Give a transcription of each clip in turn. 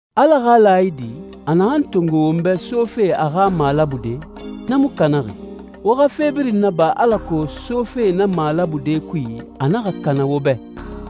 Ala xa laayidi, a naxan tongo won bɛ sofe a xa malabude, na mu kanaxi. Wo xa fe birin naba alako sofe na malabude kui a naxa kana wo bɛ.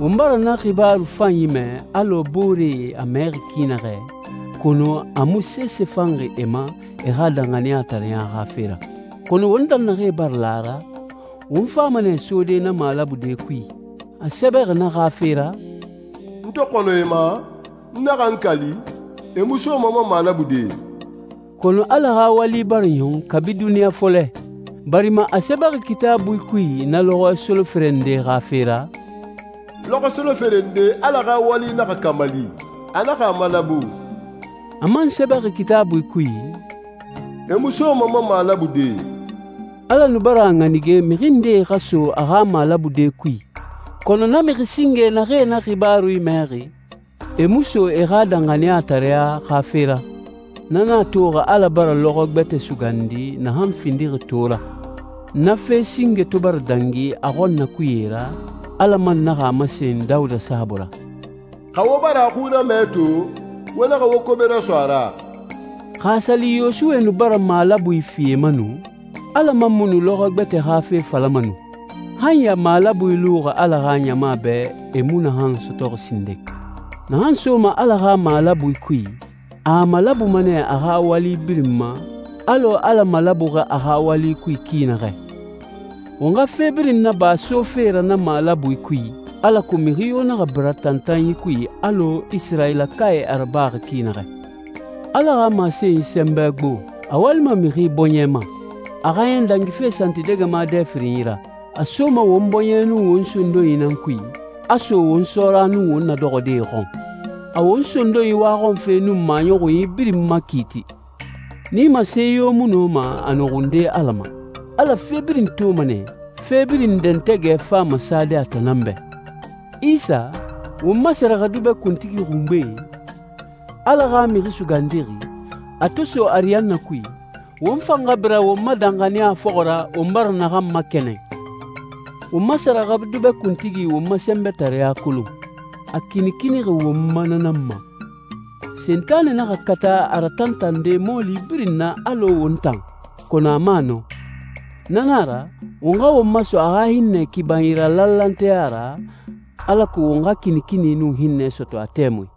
Won bara na xibaaru fanyi mɛ alɔ booree a mɛxi ki naxɛ, kɔnɔ a mu sese fanxi e ma e xa danxaniyatareɲa xa fe ra. Kɔnɔ won tan naxee bara la a ra, won fama nɛ sode na malabude kui. A sɛbɛxi na xa fe ra, «N to xɔnɔ e ma, n naxa n kali, e mu soma n ma malabude.» Kɔnɔ Ala xa wali bara ɲɔn kabi duniɲa fɔlɛ, barima a sɛbɛxi Kitaabui kui na lɔxɔɛ solofere nde xa fe ra, «Lɔxɔɛ solofere nde Ala xa wali naxa kamali. A naxa a malabu.» A man sɛbɛxi Kitaabui kui, «E mu soma n ma malabude.» Ala nu bara a ɲanige mixi ndee xa so a xa malabude kui, kɔnɔ na mixi singe naxee na xibaaru mɛxi, e mu so e xa danxaniyatareɲa xa fe ra. Na nan a toxi Ala bara lɔxɔɛ gbɛtɛ sugandi naxan findixi to ra. Na fe singe to bara dangi a xɔnnakuye ra, Ala man naxa a masen Dawuda saabui ra, «Xa wo bara a xui ramɛ to, wo naxa wo kobe raso a ra.» Xa a sa li Yosuwe nu bara malabui fi e ma nu, Ala man mu nu lɔxɔɛ gbɛtɛ xa fe falama nu. Han ya malabui luxi Ala xa ɲama bɛ e mu naxan sɔtɔxi sinden. Naxan soma Ala xa malabui kui, a a malabuma nɛ a xa wali birin ma, alɔ Ala malabuxi a xa wali kui ki naxɛ. Won xa fe birin naba sofe ra na malabui kui, alako mixi yo naxa bira tantanyi kui alɔ Isirayilakae a rabaxi ki naxɛ. Ala xa masenyi sɛnbɛ gbo, a walima mixi bɔɲɛ ma. A xaaɲɛn dangife santidɛgɛma dɛ firinyi ra. A soma won bɔɲɛ nun won sondonyi nan kui, a so won sɔɔra nun won nadɔxɔdee xɔn. A won sondonyi waxɔnfe nun maɲɔxunyi birin makiiti. Nimase yo mu nɔma a nɔxunde Ala ma. Ala fe birin toma nɛ, fe birin dɛntɛgɛ fama sade a tan nan bɛ. Isa, won ma sɛrɛxɛdubɛ kuntigi xungbe, Ala xa Mixi Sugandixi, a to so ariyanna kui, won fan xa bira won ma danxaniya fɔxɔ ra won bara naxan makɛnɛn. Won ma sɛrɛxɛdubɛ kuntigi won ma sɛnbɛtareya kolon, a kinikinixi won ma na nan ma. Sentanɛ naxa kata a ratantande mɔɔli birin na alɔ won tan, kɔnɔ a mu a nɔ. Na na a ra, won xa won maso a xa hinnɛ kibanyi ra lanlanteya ra, alako won xa kinikini nun hinnɛ sɔtɔ a tɛmui.